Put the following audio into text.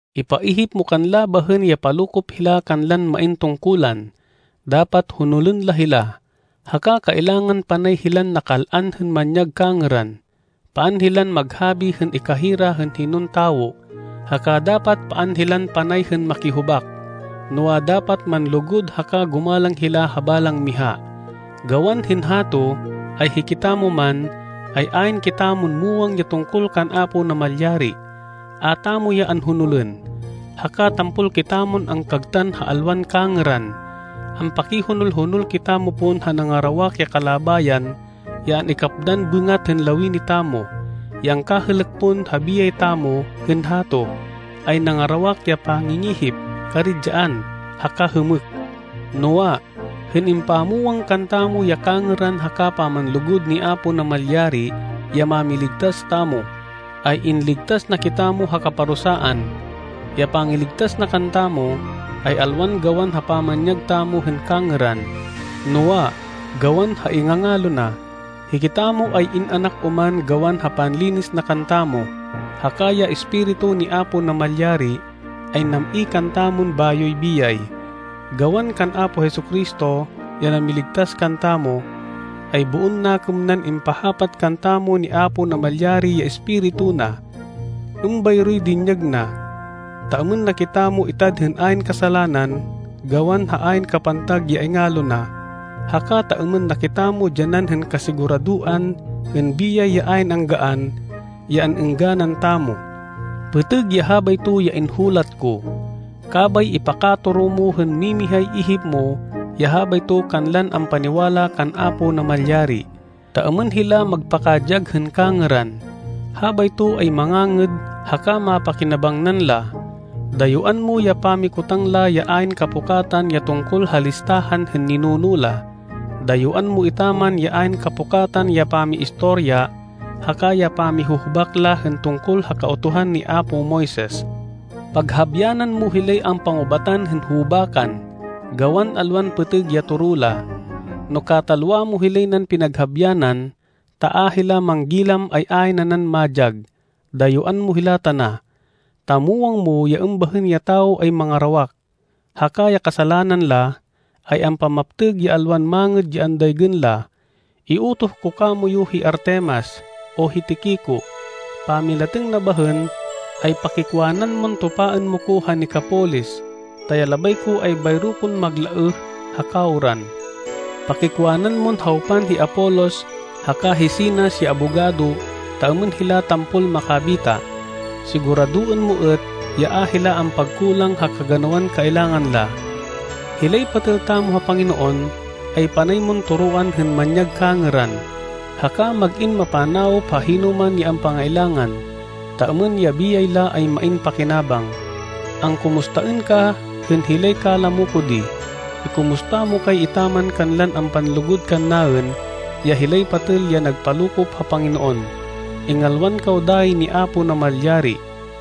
Ipaihip mo kanla bahên ya palokop hila kanlan main tungkulan. Dapat honolên la hila, haka kailangan panay hilan nakal-an hên manyag kangêran. Paan hilan maghabi hên ikahira hên hinon tawo, haka dapat paan hilan panay hên makihubak. Noa, dapat manlugud haka gumalang hila ha balang miha. Gawan hên hato ay hikitamo man, ay ayn kitamon muwang ya tungkol kan Apo Namalyari. A tamo ya anhonolên, haka tampol kitamon angkagtan ha alwan kangêran. Ampakihonol-honol kitamo pon ha nangarawak ya kalabayan ya an-ikapdan bêngat hên lawini tamo. Ya angkahêlêk pon ha biyay tamo hên hato ay nangarawak ya pangingihip, karidyaan, haka hêmêk. Noa, hên impamwang kantamo ya kangêran haka pamanlugud ni Apo Namalyari ya Mámiligtas tamo, ay inligtas na kitamo ha kaparusaan. Ya pangiligtas na kantamo, ay alwan gawan ha pamanyag tamo hên kangêran, noa, gawan ha ingangalo na. Hikitamo ay in-anak oman gawan ha panlinis na kantamo. Haka ya Espiritu ni Apo Namalyari ay nam-i kantamon bayoy biyay. Gawan kan Apo Jesu-Cristo ya namiligtas kantamo, ay boon nakêm nan impahapat kantamo ni Apo Namalyari ya Espiritu na. Êmbayroy dinyag na, ta êmên na kitamo itad hên ayn kasalanan gawan ha ayn kapantag ya ingalo na, haka ta êmên na kitamo dyanan hên kasiguradoan hên biyay ya ayn anggaan, ya an-êngganan tamo. Pêtêg ya habayto ya inhulat ko. Kabay ipakatoro mo hên mimihay ihip mo ya habayto kanlan ampaniwala kan Apo Namalyari, ta êmên hila magpakadyag hên kangêran. Habayto ay mangangêd haka mapakinabangnan la. Dayuán mo ya pamikotang la ya ayn kapukatan ya tungkol ha listahan hên ninuno la. Dayuán mo etaman ya ayn kapukatan ya pamiistorya haka ya pamihuhubak la hên tungkol ha Kautuhan ni apo Moises. Paghabyanan mo hilay ampangubatan hên hubakan, gawan alwan pêtêg ya toro la. No katalwa mo hilay nan pinaghabyanan, ta a hila manggilam ay ayn nanan madyag. Dayuán mo hila tana. Ta muwang mo ya êmbahên ya tawo ay mangarawak, haka ya kasalanan la, ay ampamaptêg ya alwan mangêd ya andaygên la. Iutoh ko kamoyu hi Artemas, o hi Tiquico. Pamilatêng na bahên ay pakikwanan mon tupaên mo ko ha Nicapolis, ta ya labay ko ay bayro kon maglaêh ha kawran. Pakikwanan mon hawpan hi Apolos haka hi Zenas ya abogado ta êmên hila tampol makabita. Siguradoên mo êt ya a hila ampagkulang ha kaganawan kailangan la. Hilay patêl tamo ha Panginoon, ay panay mon toroan hên manyag kangêran, haka mag-in mapanawop ha hinoman ya ampangailangan, ta êmên ya biyay la ay main pakinabang. Angkumustaên ka hên hilay kalamo ko di. Ikumusta mo kay etaman kanlan ampanlugud kannaên, ya hilay patêl ya nagpalokop ha Panginoon. Ingalwan kaw dayi ni Apo Namalyari.